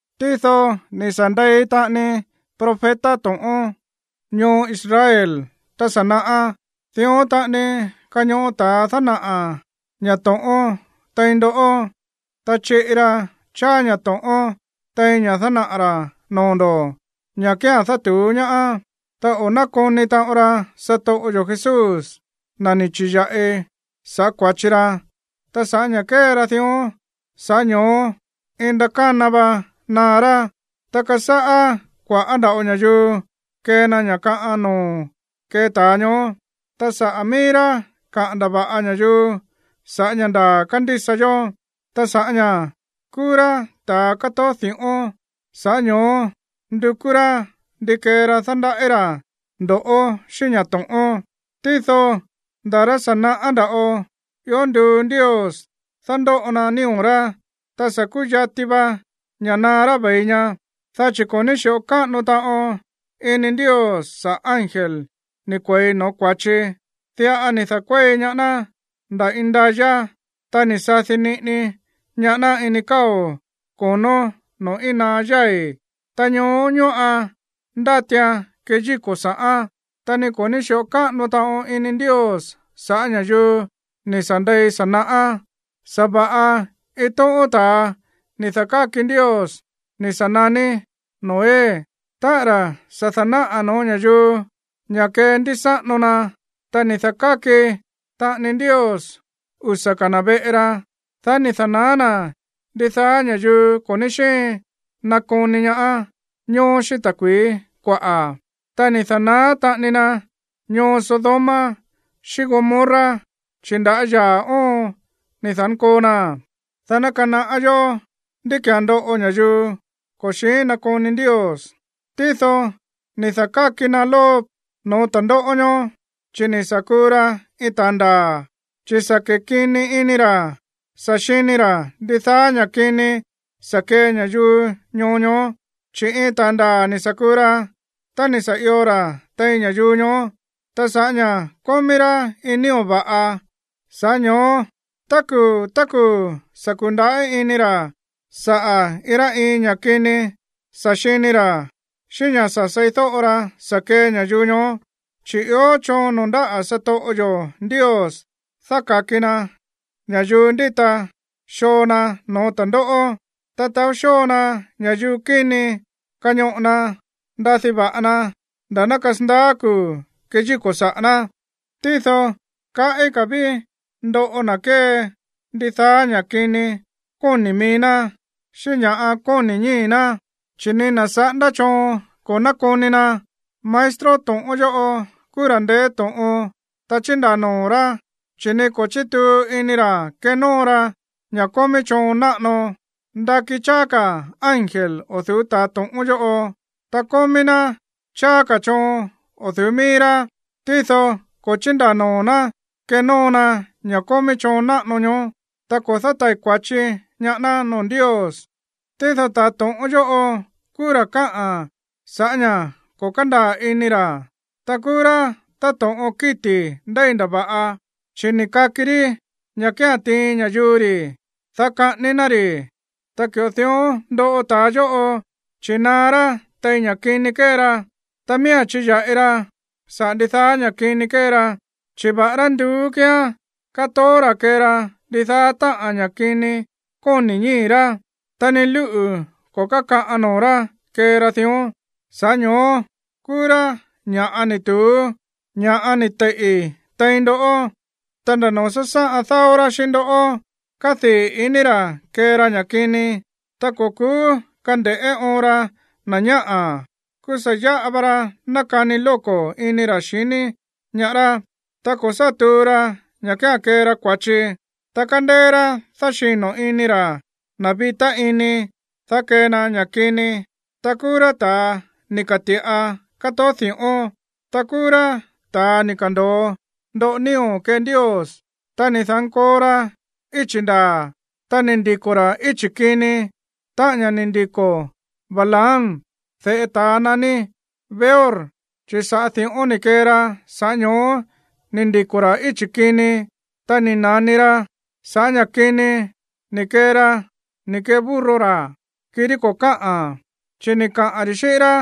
Tído ni̱ sa̱ ndei taꞌani profeta to̱ꞌón ñoo Israel tá sa̱ naꞌá. Dión taꞌani kañoꞌo ta̱a dánaꞌa̱ ña̱ to̱ꞌón tein ndoꞌó, ta chiꞌi ra cháá ña̱ to̱ꞌón tein ña̱ dánaꞌa̱ ra̱ noo̱ ndo̱, ña̱ kía̱n dátu̱ú ñaá. Ta o̱ nákoni taꞌon ra satoꞌo yo̱ Jesús, na̱ ni̱ chi̱ya̱ꞌi sa̱ꞌá kua̱chi ra. Ta sa̱ꞌá ña̱ kee ra dión, sa̱ꞌá ño̱ó iin ndakána vá naá rá. Ta kasáꞌá kua̱ꞌá nda̱ꞌo ña̱yuu kee na ña̱ kaꞌan noo̱ kee ta̱a ñoó, ta saꞌa̱ míí rá kaꞌa̱n ndava̱ꞌa ña̱yuu sa̱ꞌá ña̱ ndaa̱ kándísa yó. Ta sa̱ꞌá ña̱ kúú rá ta̱a kátoó di̱ꞌón, sa̱ꞌá ño̱ó ndukú rá ndi kee ra dándaꞌí ra̱ ndo̱ꞌó xíꞌín ña̱ to̱ꞌón. Tído nda̱ rá sa̱ naꞌá nda̱ꞌo ió nduu Ndios dándóꞌo na nío̱ rá, ta sa̱ kuyati va ña̱ naá rá ve̱i ña. Dá chi̱ ko̱ ní xi̱ꞌo káꞌano taꞌon ini Ndios saꞌa̱ ángel ni̱ kue̱i no̱ó kua̱chi, diꞌa ni̱ da̱kuéi ñaá ná nda̱ indayá, ta ni̱ sadi niꞌini ñaá ná ini káo̱ ko̱nó noo̱ íin naá yái̱, ta ñoó ñóꞌan ndátian keyíko̱ sa̱ꞌán. Ta ni ko̱ ní xi̱ꞌo káꞌano taꞌon ini Ndios sa̱ꞌá ña̱yuu ni̱ sa̱ ndei sa̱ naꞌá. Sa̱va̱ꞌa iin tóꞌón ta̱a ni̱ da̱káki Ndios ni̱ sa̱ naní Noé, táꞌa̱n ra̱ sa̱ da̱náꞌa̱ no̱ó ña̱yuu ña̱ kendísáꞌano na, ta ni̱ da̱káki taꞌani Ndios usa̱ ka̱ na̱ veꞌe ra. Dá ni̱ da̱naá na̱ ndidaá ña̱yuu ko̱ ní xíin nakoni ñaá ñoó xíꞌín ta̱kui̱í kuaꞌa̱. Ta ni̱ da̱naá taꞌani na ñoo Sodoma xíꞌín Gomorra, chi̱ nda̱á yaa̱ óon ni̱ da̱nkoo naa̱n, dá ná kanaꞌá yó ndí ki̱án ndoꞌo ña̱yuu ko̱ xi̱ín nakoni Ndios. Tído ni̱ da̱káki na Lot no̱ó ta̱ndóꞌó ñóó, chi̱ ni̱ sa̱ kuu ra iin ta̱a ndaa̱, chi̱ sa̱ kekini ini ra̱ sa̱ xini ra̱ ndidaá ña̱ kini sa̱ kee ña̱yuu ñoo ñoó. Chi̱ iin ta̱ ndaa̱ ni̱ sa̱ kuu ra, ta ni̱ sa̱ io ra̱ tein ña̱yuu ñoó. Ta sa̱ꞌá ña̱ kómí rá iin nío̱ va̱ꞌa, sa̱ꞌá ño̱ó tá kuu̱ tá kuu̱ sa̱ ku̱ndaꞌí ini ra̱ sa̱ꞌá iin rá iin ña̱ kini sa̱ xini ra̱ xíꞌín ña̱ sa̱ seídóꞌo ra sa̱ kee ña̱yuu ñoó. Chi̱ ió choon noo̱ ndáꞌa̱ satoꞌo yo̱ Ndios dáka̱ki na ña̱yuu ndíta xoo na no̱ó ta̱ndóꞌó. Ta taó xóo na ña̱yuu kíni kañoꞌo na ndadí va̱ꞌa na nda̱ ná kasandaá kuu̱ keyíko̱ saꞌa̱ ná. Tído kaꞌí ka̱ ví ndoꞌo na̱ kée ndidaá ña̱ kini kóni̱ mií ná, xíꞌín ña̱ kóni̱ ñíi̱ ná, chi̱ ni na̱ saꞌándá choon ko̱ nákoni na̱. Maestro to̱ꞌón yóꞌo kúú ra̱ ndeé to̱ꞌon, ta chíndaa̱ noo̱ rá, chi̱ ni ko̱ chítuu ini ra̱ kenóo ra ña̱ kómí choon náꞌano. Ndakí cháá ka̱ ángel o̱ du̱ú ta̱a to̱ꞌón yóꞌo, ta kómí ná cháá ka̱ choon o̱ du̱ú mií rá, tído ko̱ chíndaa̱ noo̱ ná kenóo na ña̱ kómí choon náꞌano ñoó, ta ko̱ dátai̱ kua̱chi ñaá ná noo̱ Ndios. Tído ta̱a to̱ꞌón yóꞌo kúú ra̱ káꞌa̱n sa̱ꞌá ña̱ ko̱ kándaa̱ ini ra̱. Ta kúú rá táto̱ꞌon kíti̱ ndéi ndava̱ꞌa, chi̱ ni̱ kaki rí ña̱ kía̱n tiin ña̱yuu ri̱, dá kaꞌání ná ri̱. Ta ki̱ꞌo dión ndoꞌo ta̱a yóꞌo, chi̱ naá rá tein ña̱ kini kée ra. Ta miía̱n chiya̱ꞌi ra saꞌa̱ ndidaá ña̱ kini kée ra, chi̱ va̱ꞌará nduú kíán, kátoó ra̱ kée ra ndidaá táꞌa̱n ña̱ kini kóni̱ ñíi̱ rá, ta ni lúꞌu̱ ko̱ kákaꞌan noo̱ rá kée ra dión. Sa̱ꞌá ño̱ó kúú rá ña̱ ni̱ tu̱ú, ña̱ ni̱ teiꞌi̱ tein ndoꞌó. Ta nda̱ noo̱ sásáꞌan dáó rá xíꞌín ndó, kádii̱ iní ra̱ kée ra ña̱ kini. Ta ko̱ ku̱ú kande̱ꞌé oon ra na̱ ñáꞌa̱, kúú sa̱ yáꞌa va ra nákani lóko̱ ini ra̱ xiní ñaá rá. Ta ko̱ sá tuu ra ña̱ kía̱n kée ra kua̱chi. Ta kándéé rá dáxino̱ ini ra̱ na̱ vitá ini, dá kee na ña̱ kini. Ta kúú rá ta̱a ni̱ ka̱ti̱ꞌa kátoó di̱ꞌón. Ta kúú rá ta̱a ni̱ ka̱ndo̱o ndoꞌo nío̱ kee Ndios. Ta ni̱ da̱nkoo ra íchi̱ ndaa̱, ta ni̱ ndiko̱ ra̱ íchi̱ kini, táꞌa̱n ña̱ ni̱ ndiko̱ Balaam, de̱ꞌe ta̱a naní Beor, chi̱ sa̱ꞌá di̱ꞌón ni̱ kee ra, sa̱ꞌá ño̱ó ni̱ ndiko̱ ra̱ íchi̱ kini. Ta ni̱ na̱ni ra sa̱ꞌá ña̱ kini ni̱ kee ra ni̱ kee burro ra̱, kirí ko̱ káꞌa̱n. Chi̱ ni̱ kaꞌa̱n ri̱ xíꞌín rá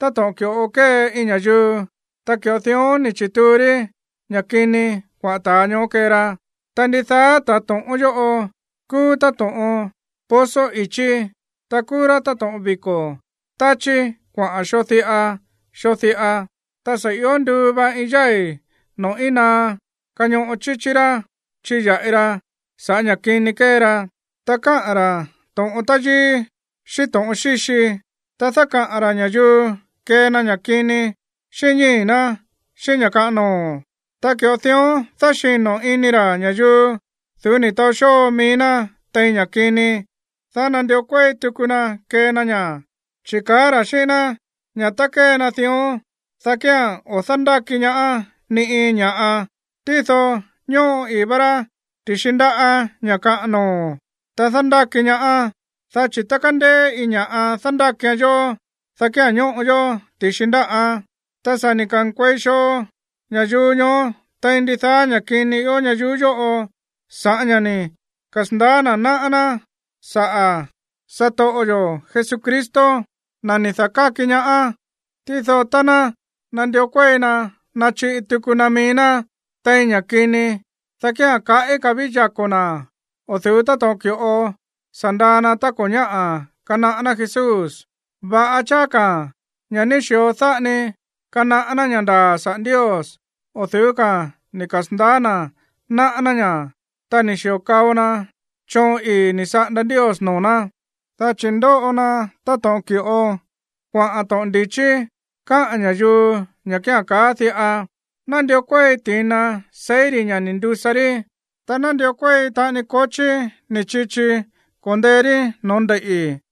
táto̱ꞌon ki̱ꞌo kée iin ña̱yuu, ta ki̱ꞌo dión ni̱ chi̱tuu rí ña̱ kini kuaꞌa̱n ta̱a ñoó kee ra. Ta ndidaá ta̱a to̱ꞌón yóꞌo kúú táto̱ꞌon pozo i̱chí, ta kúú rá táto̱ꞌon viko̱ táchí kuaꞌa̱n xoo diꞌa, xoo diꞌa. Ta sa̱ io nduu va iin yái̱ noo̱ íin naá kañoꞌo chíchí rá chiya̱ꞌi ra sa̱ꞌá ña̱ kini kée ra. Ta káꞌa̱n ra̱ to̱ꞌon táyíí xíꞌín to̱ꞌon xíxi. Ta dákaꞌa̱n ra̱ ña̱yuu kee na ña̱ kini xíꞌín ñíi̱ ná xíꞌín ña̱ kaꞌan noo̱, ta ki̱ꞌo dión dáxino̱ ini ra̱ ña̱yuu du̱ú ni̱ taó xóo mií ná tein ña̱ kini, dá nandió kuéi tuku na kee na ña̱. Chi̱ káꞌa̱n ra̱ xíꞌín ná ña̱ tá kee na dión, dá kía̱n o̱ dándáki ñaá ni iin ña̱ꞌa. Tído ñóꞌo ii̱ vá rá ti̱xi ndáꞌa̱ ña̱ kaꞌan noo̱, ta dándáki ñaá. Dá chi̱ tá kándéé iin ña̱ꞌa dándákian yó, dá kía̱n ñóꞌo yó ti̱xi ndáꞌán. Ta sa̱ ni̱ ka̱nkuei xoo ña̱yuu ñoó tein ndidaá ña̱ kini ió ñayuú yóꞌo sa̱ꞌá ña̱ ni̱ kasa̱ndaá na̱ náꞌá ná saꞌa̱ satoꞌo yo̱ Jesucristo, na̱ ni̱ da̱káki ñaá. Tído tá ná nandió kuéi na nachiꞌi tuku na mií ná tein ña̱ kini, dá kía̱n kaꞌí ka̱ ví yako̱ na̱ o̱ du̱ú táto̱ꞌon ki̱ꞌo sa̱ ndaa na tá ko̱ ñáꞌa̱ kanaꞌá ná Jesús. Va̱ꞌa cháá ka̱ ña̱ ní xi̱o dáꞌa ni kanaꞌá ná ña̱ ndaa̱ saꞌa̱ Ndios, o̱ du̱ú ka̱a̱n ni̱ kasa̱ndaá na̱ náꞌá ná ña̱, ta ni̱ xi̱o kao na choon ii̱ ni̱ saꞌanda Ndios noo̱ ná. Dá chi̱ ndóꞌo na táto̱ꞌon ki̱ꞌo kuaꞌa̱n to̱ꞌon ndi̱chí káꞌa̱n ña̱yuu ña̱ kía̱n kaá diꞌa: “Nandió kuéi ti̱na seí ri̱ ña̱ ni̱ ndusa rí, ta nandió kuéi taꞌani kochí ni̱ chichi ko̱ndee rí no̱ó ndeiꞌi̱.”